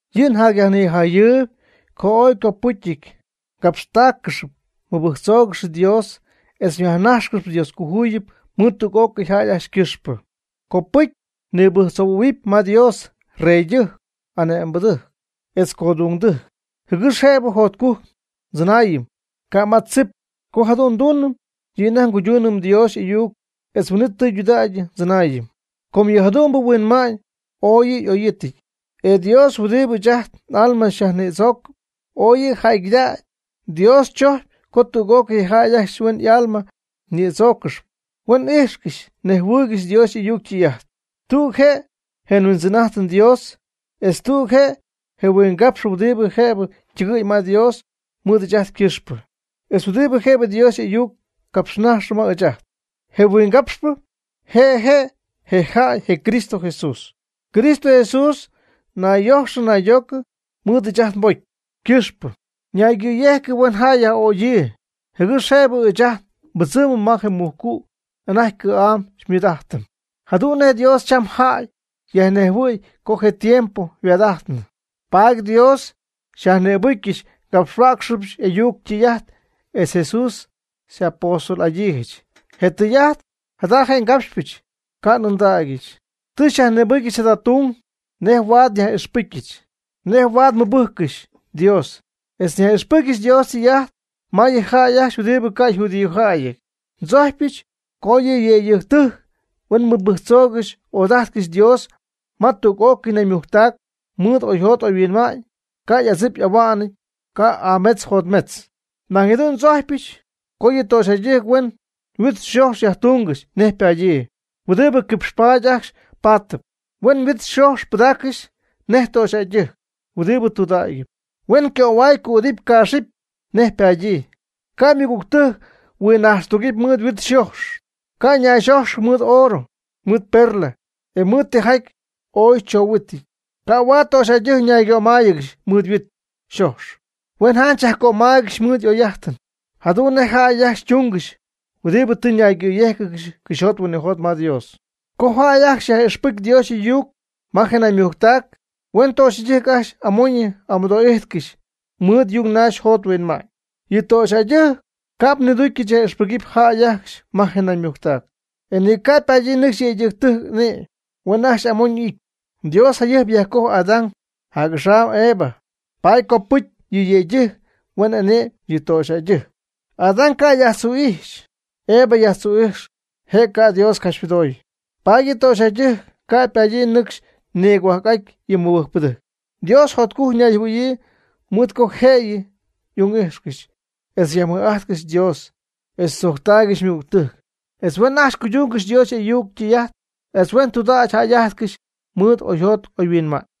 Yɨ' njatyyajnɨmaayb co ooy ycopɨcyɨty capxtaaccɨxy mɨbɨjctzoogɨxy Dios etz yajnajxcɨxy Dioscojuyip mɨɨd tüg'ócɨy jäy ajcxy ycɨxpɨ. Copɨcy nnibɨjctzoohuɨm ma Dios: reydɨjc, ane'mbɨdɨjc etz codungdɨjc, jɨgɨx jëbɨ jotcujc ndzɨnaayɨm, ca' ma tzip. Co jadu'n nduunɨm, yɨ' anajty ngoduunɨm Dios y'ayuc, etz huin'it tɨydudägy ndzɨnaayɨm. Com yɨ jadu'mbɨ huinma'ñ ooy yɨ' y'oyɨty, e Dios huɨdibɨ ɨɨch ajt n'alma yajnïdzoocp, oy yɨ' jäygɨdägy. Dios chojcpy co tüg'ócɨy je jäy ajcxy huen y'alma nïdzooccɨxy, huen ijxcɨxy nejhuɨɨygɨxy Dios y'ayuc ytɨy'ajt. Tüg je' je nHuindzɨn'ajtɨm Dios, etz tüg je' je huingapxpɨ huɨdibɨ jëbɨ ytɨgɨ̈y ma Dios mɨɨd ɨɨch ajt ycɨxpɨ, etz huɨdibɨ jëb Dios y'ayuc capxnajxy ma ɨɨch ajt: je huingapxpɨ, je' je' je jäy, je Cristo Jesús. Cristo Jesús nayyojxɨ naydoocɨ mɨɨd ɨɨch ajt nbocy ycɨxpɨ, ñaygɨ̈yejcɨ huen jäy yaj'ögyii, jɨgɨx jëb ɨɨch ajt nbɨdzɨɨmɨm ma je mujcu' anajty cɨ̈'am xymɨɨd'ajtɨm. Jadu'n nej Dios cham jäy yajnejhuɨ̈y co je tiempo yhuaad'ajtnɨ, paady Dios tɨ xyajnïbɨcyɨch ngapxhuäcxɨbɨch y'ayuc ytɨy'ajt, etz Jesús xy'apóstol'adyiijɨch. Je tɨy'ajt jada ngapxpɨch, ca' n'ɨndägyɨch. Tɨ xyajnïbɨcyɨch jada tung nej jëb huaad nyaj'ixpɨcyɨch, nej jëb huaad mɨbɨjccɨxy Dios, etz nyaj'ixpɨcyɨch Dios ytɨy'ajt ma yɨ jäy ajcxy huɨdibɨ ca' yjudíojäyɨty. Ndzojcpyɨch co yɨ yëydɨjctɨjc huen mɨbɨjctzoogɨxy ojadajtcɨxy Dios ma tüg'ócɨy naymujctac mɨɨd oyjot oyhuinma'ñ, ca' y'adzip y'ahuan'nɨty, ca' y'ametz yjotmetzɨty. Nañ jadu'n ndzojcypɨch co yɨ töxyjäydɨjc huen yhuit yxojx yajtungɨxy nej ypadyii, huɨdibɨ quipxpaady ajcxy paatɨp. Huen yhuit yxojx pɨdaaccɨxy nej töxyjäydɨjc huɨdib tudägyɨp. Huen ycöhuay cüdɨ̈gy caaxɨ̈gy nej ypadyii, ca' ymɨgügtɨjc huinnaxtugɨpy mɨɨd yhuit yxojx, ca' nayxójxɨgɨxy mɨɨd oorɨ, mɨɨd perla, e mɨɨd tijaty ooy choohuɨty. Ca' huaad töxyjäydɨjc ñaygömáyɨgɨxy mɨɨd yhuit yxojx, huen janch yajcömaygɨxy mɨɨd y'oyjäy'ajtɨn, jadu'n nej je jäy ajcxy tungɨxy huɨdibɨ tɨ ñaygɨ̈yéjcɨgɨxy cɨxyjot huinɨjot ma Dios. Co jäy ajcxy yaj'ixpɨcy Dios y'ayuc ma je naymujctac, huen töxyjäydɨjc ajcxy amoyñɨ amɨdoo'ijtcɨxy mɨɨd yungnaxy yjot yhuinma'ñ. Yɨ töxyjäydɨjc ca'p niducyɨch yaj'ixpɨgɨpy jäy ajcxy ma je naymujctac. E ni ca' ypadyii nɨcxy yëydɨjc ane'my. Huen ajcxy amoñɨ y'ity. Dios jayɨjp yajcojy Adán, jac'axam Eva, paady ycopɨcy yɨ yëydɨjctɨjc huen ane'my yɨ töxyjäydɨjc. Adán ca' yajtzu'ijxy. Eva yajtzu'ijx, je' ca' Dios capxymɨdoy. Paady yɨ töxyjäydɨjc ca' ypadyii nɨcxy nigohuajc'aty yɨ mɨbɨjcpɨdɨjc. Dios jotcujc ñayjɨhuɨ̈yii mɨɨd co jëyɨ y'ung'ijxcɨxy, etz yajmɨj'ajtcɨxy Dios, etz tzojctaaygɨxy ymɨgügtɨjc, etz huen ajcxy cuydungɨxy Dios y'ayuc ytɨy'ajt, etz huen tudägy jäy'ajtcɨxy mɨɨd oyjot oyhuinma'ñ.